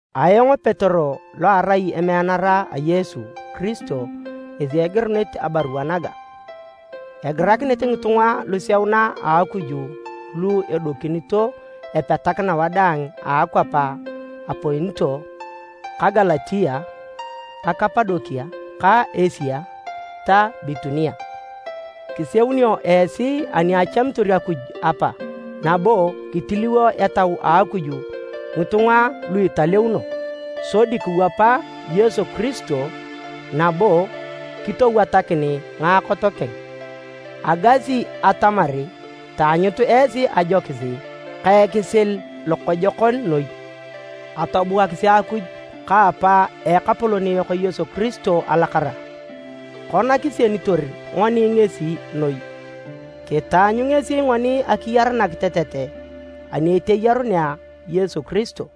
Ayong Petero lo arai emeanara a Yesu Kiristo ngesi egirunit abarua naga. Egirakinit ngitunga luseuna a Akuj lu edokinito epetakina wadaang a akwap a Ponto, ka Galatia, ka Kapadokia, ka Asia ta Bitunia. Kiseunio esi ani achamitor Akuj Apa, nabo kitiliwo Etau a Akuj ngitunga lu italeuno, sodi kiwapa Yesu Kiristo nabo kitowatakin ngaakot keng. Agasi atamar taanyut esi ajokis ka ekisil lokojokon noi. Atobuakisi Akuj ka Apa a Ekapolon yok Yesu Kiristo alakara! Kona kisienitor ngoni ngesi noi, kitaanyu ngesi ngoni akiyar nakitetet ani eteyarunea Yesu Kiristo.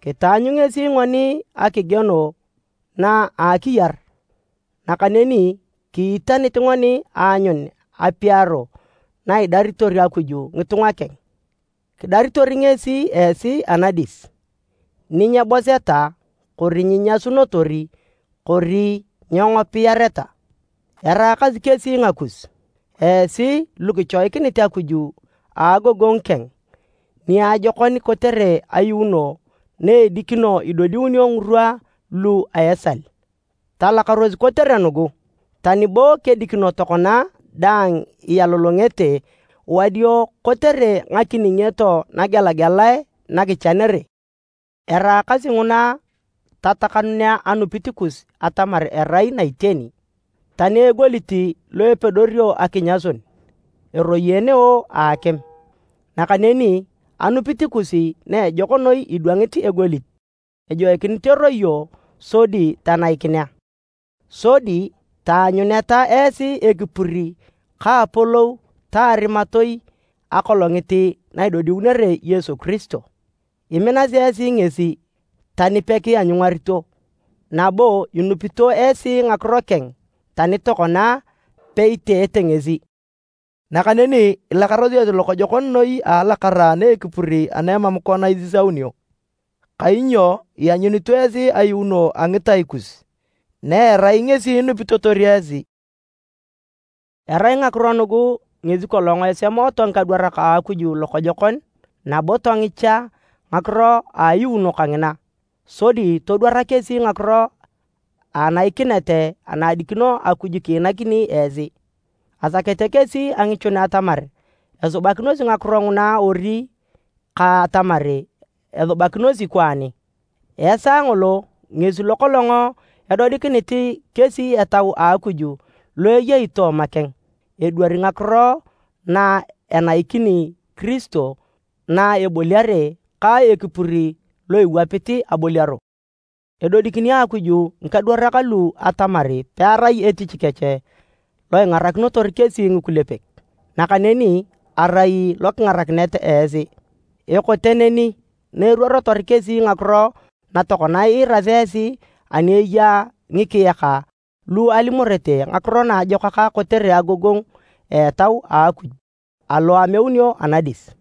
Kitaanyu ngesi ngoni akigieno na a akiyar, nakaneni kiitanit ngoni aanyun apiaro na idaritor Akuj ngitunga keng. Kidaritor ngesi esi anadis, ni nyeboseta kori nyiinyasunotor kori nyeengopiareta. Eraakasi kesi ngakus, esi lu kichoikinit Akuj a agogongu keng niajokon kotere ayuuno na edikino idodiunio ngirwa lu a esal. Talakaros kotere nugu, tani bo kedikino tokona dang ialolongete wadio kotere ngakiningioto nagelagelae na kichanere. Eraakasi nguna tatakanunea anupit kus atamar erai na iteni. Tani egolit lo epedorio akinyasun, eroyeeneo a akim, nakaneni anupit kus na ejok noi idwangit egolit, ejoikinit eroyo sodi tanaikinea. Sodi taanyuneta esi ekipur ka apolou ta arimatoi Akolongit na idodiunere Yesu Kiristo. Iminasi esi ngesi tani pakianyungarito, nabo inupito esi ngakiro keng tani tokona peiteete ngesi. Nakaneni ilakarosi esi lokojokon noi a alakara ana a ekipur ana emam kona isisaunio, kainyo ianyunito esi ayuuno a ngitai kus, na erai ngesi inupitotor esi. Erai ngakiro nugu ngesi kolong esemooto ngikadwarak a Akuj lokojokon, nabo tongicha ngakiro a ayuuno kangina, sodi todwara kesi ngakiro a ainakinet ana adikino Akuj kiinakini esi. Asakete kesi angichun atamar esubakinosi ngakiro nguna ori ka atamar esubakinosi kwaani. Esaa ngolo ngesi lo kolong edodikinit kesi Etau a Akuj lo ayei tooma keng, edwari ngakiro na enaikini Kiristo na eboliare ka ekipur lo iwapit aboliaro. Edodikini Akuj ngikadwarak lu atamar pearai etich kech lo ingarakinotor kesi ngikulepek, nakaneni arai lo kingarakinet esi. Ekote neni na eruorotor kesi ngakiro na tokona iirasi esi ani eya ngikiyaka lu alimorete Ngakiro Naajokak kotere agogongu a Etau a Akuj alo ameunio anadis.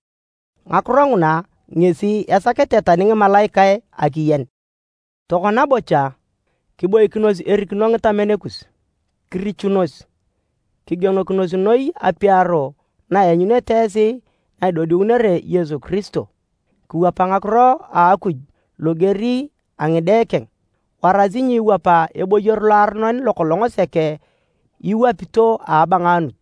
Ngakiro nguna ngesi esakete tani ngimalaikae akiyen. Tokona bocha, kiboikinos erikino ngitamen kus. Kirichunos, kigienokinos noi apiaro na ianyunete esi na idodiunere Yesu Kiristo. Kiwapa ngakiro a Akuj loger a ngide keng, warasi nyiiwapa eboyor loaronon lo kolong sek iwapito a abangaanut.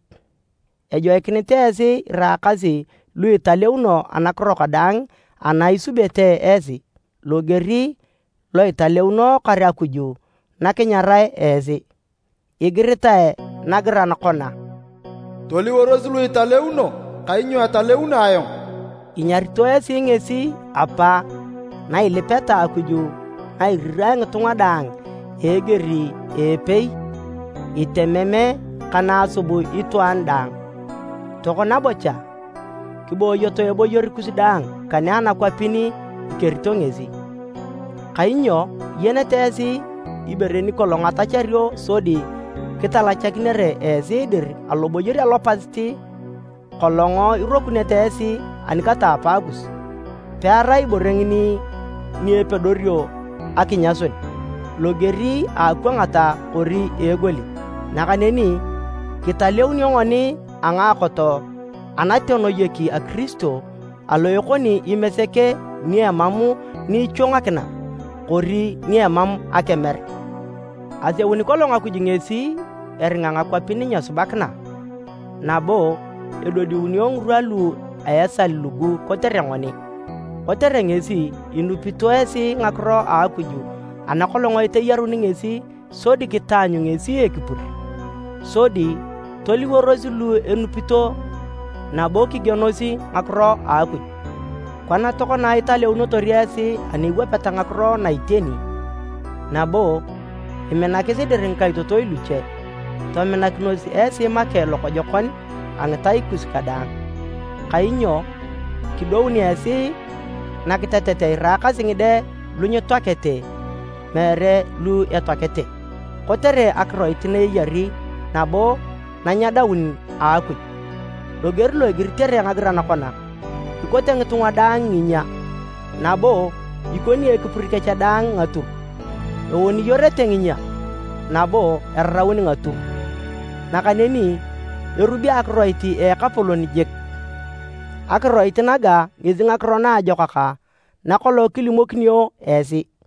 Ejoikinit esi iraakasi lu italeuno anakiro kadaang ana isubete esi, loger lo italeunookor Akuj na kinyarae esi. Igiritae nagiran kona, “Toliworos lu italeuno kainyo etaleuno ayong.” Inyarito esi ngesi Apa na ilipeta Akuj na irirae ngitunga daang a eger a epei, itemem ka na asub itwaan daang. Tokona bocha, kiboyoto eboyor kus daang kane anakwapin ikerito ngesi. Kainyo iyenete esi ibore ni kolong atachario sodi kitalachakinere esi dir aloboyor alopasit kolong irokunete esi ani kata apaakus. Pearai ibore ngini ni epedorio akinyasun, loger a akwangat kori egolit, nakaneni kitaleunio ngoni a ngaakot anatenoyek a Kiristo alo ekoni imesek ni emam ni ichwangakina kori ni emam akemer. Aseuni kolong Akuj ngesi eringa ngakwapin nyesubakina nabo edodiunio ngirwa lu a esal lugu kotere ngoni. Kotere ngesi, inupito esi ngakiro a Akuj ana kolong eteyaruni ngesi sodi kitaanyu ngesi ekipur, sodi toliworos lu inupito nabo kigienos ngakiro a Akuj. Kona tokona italeunotor esi ani iwapeta ngakiro na iteni, nabo iminakis dir ngikaitotoi luche, tominakinos esi make lokojokon a ngitai kus kadaang. Kainyo kidoun esi nakitetet iraakasi ngide lu nyetoakete, meere lu etoakete, kotere akiroit na eyari nabo na nyedaun a Akuj. Loger lo igiritere nagiran kona, “Ikote ngitunga daang nginyia, nabo ikoni ekipur kech dang ngatur. Eoniyorete nginyia, nabo eraraun ngatur, nakaneni erubi akiroit a Ekapolon jik.” Akiroit naga ngesi Ngakiro Naajokak na kolong kilimokinio esi.